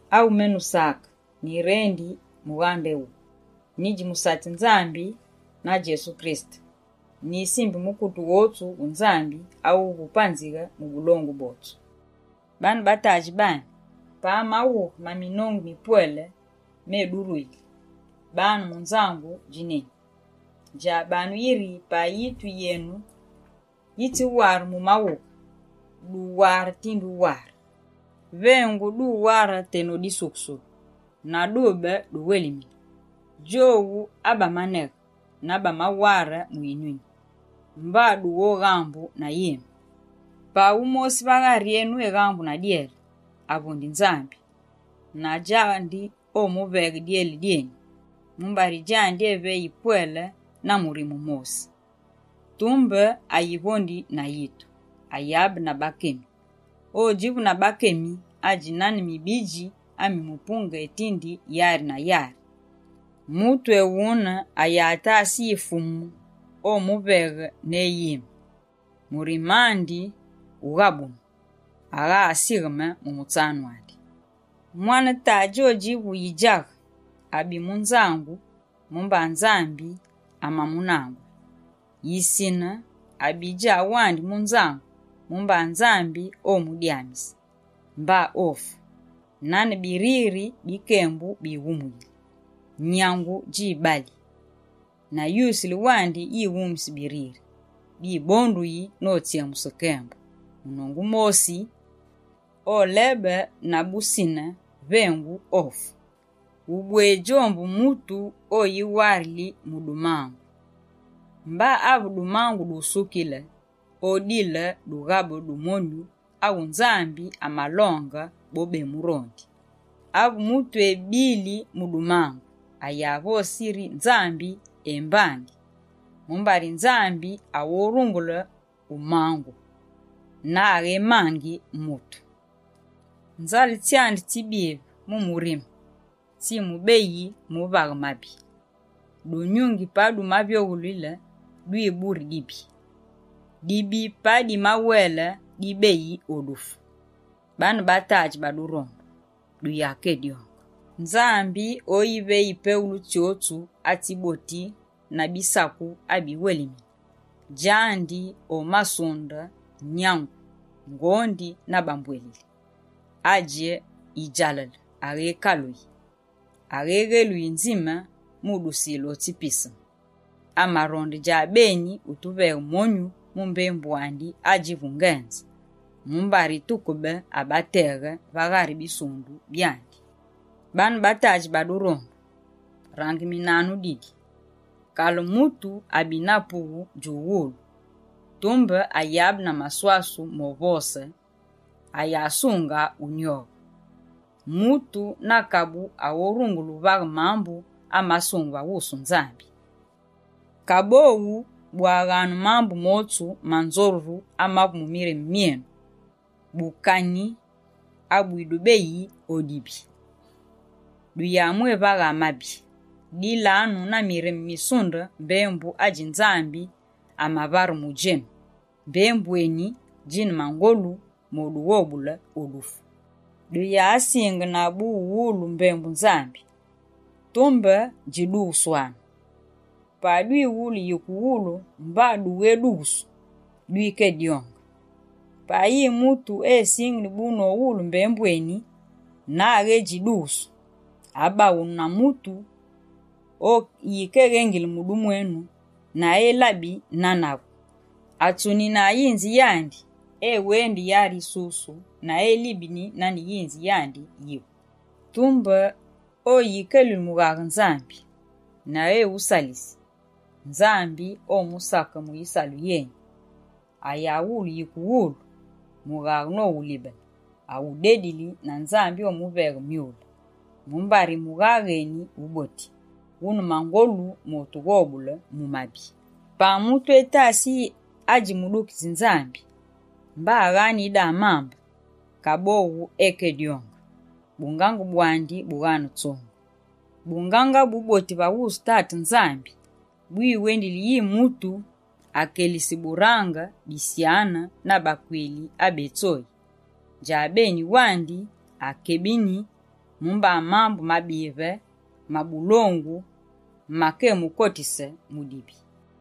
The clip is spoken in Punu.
Awu menu Sake nyirendi mughande éwuwu. Nyidji musatsi Nzambi na Fumu Djesu Kirisete. Nyisimbi mukute wotsu wu Nzambi awuvu wupanzighe mu bulongu bwotsu. Baane ba tadji bami! Pa maghughe maminongu mipwele meduruyili, banu mu nzangu dji neni. Djabanu yiri, pa yitu yenu yitsiware mu maghughe, duware tinde uware. Vengu duware teno disukusulu, na dube duwelimine, djowu abamaneghe na bamaware mu yinyuni, mba dughoghambu na yime. Pa wumosi va ghari enu eghambu na dyele, avondi Nzambi, na djandi omuveghe dyele dyeni. Mumbari djandi, eveyi pwele na murime mosi. Tumbe ayivondi na yitu, ayabe na bakemi. Odjivu na bakemi, adji nane mibidji ami mupunge etinde yari na yari. Mutu ewune, ayatase yi Fumu omuveghe ne yime. Murime andi wughabunu, agha asigheme mu mutsanu andi. Mwane tadji odjivu yidjaghe, abi mu nzangu mumba Nzambi amamunangule. Yisine, abi djawandi mu nzangu, mumba Nzambi omudyamise. Mba ofu, nane biriri bi kembu bighumuyili. Nyangu djibali, na yusile wandi yighumusi biriri. Bibonduyi notsyemuse kembu. Munongu mosi, olebe na busine vengu ofu. Ubwedji ombu mutu oyiwarili mu dumangu. Mba ave dumangu dusukile, odile dughabe du monyu awu Nzambi amalonge bobemurondi. Ave mutu ebili mu dumangu, ayavose yiri Nzambi embangi, mumbari Nzambi aghorungule umangu, na aghémangi mutu. Nzale tsyandi tsibive mu murime, tsimubeyi mu uvaghe mabi. Dunyungi pa dumavyoghulile dwiburi dibi, dibi pa dimawele dibeyi o dufu. Baane ba tadji ba durondu, duyakedyonge. Nzambi oyiveyi peghulu tsyotsu atsiboti na bisaku abiwelemine. Djandi omasunde, nyangu, ngondi na bambwelili. Adji yidjalale aghékaluyi, aghéghéluyi nzime mu udusile o tsi piseme. Amaronde djabeni utuveghe monyu mu mbembu andi adjivu ngenze, mumbari tukebe abateghe, va ghari bisundu byandi. Baane ba tadji ba durondu, rangeminanu didi: kale mutu abi na pughu djuwulu, tumbe ayabe na maswasu movose, ayasunga unyoghe. Mutu na kabu aghorungule uvaghe mambu amasungeme va wusu Nzambi. Kaboghu, bwaghanu mambu motsu manzoruru amavu mu mirime myenu, bukani abwidubeyi o dibi, duyamwévaghe mabi. Dilanu na mirime misunde mbembu adji Nzambi amavare mu djenu. Mbembu eni, djine mangolu modughobule o dufu. Duyasingene bu mu uwulu mbembu Nzambi, tumbe djidughuswanu. Pa dwiwulu yike uwulu mba dughédughusu, dwikedyonge. Pa yi mutu esingini bu nowulu mbembu eni na aghédjidughusu, abaghunu na mutu oyikeghengili mu dumwenu na elabi nane avu, atsunina yinzi yandi, ewendi yari yisusu, na elibeni nane yinzi yandi yivu. Tumbe oyikeluli mughaghe Nzambi, na ewusalisi, Nzambi omusake mu yisalu yeni. Ayawulu yike uwulu mughaghe nowulibene, awudedili na Nzambi omuveghe myule. Mumbari mughaghe eni wuboti, wune mangolu motughobule mu mabi. Pa mutu etasi yi adji mudukitsi Nzambi, mba aghane yidamambe, kaboghu ekedyonge, bungange bwandi bughane tsongu. Bungange abuboti va wusu Tate Nzambi, bwiwendili yi mutu akelisi burange bisyane na bakwili abetsoyi. Djabeni wandi akebini mumba mambu mabive ma bulongu makemukotise mu dibi.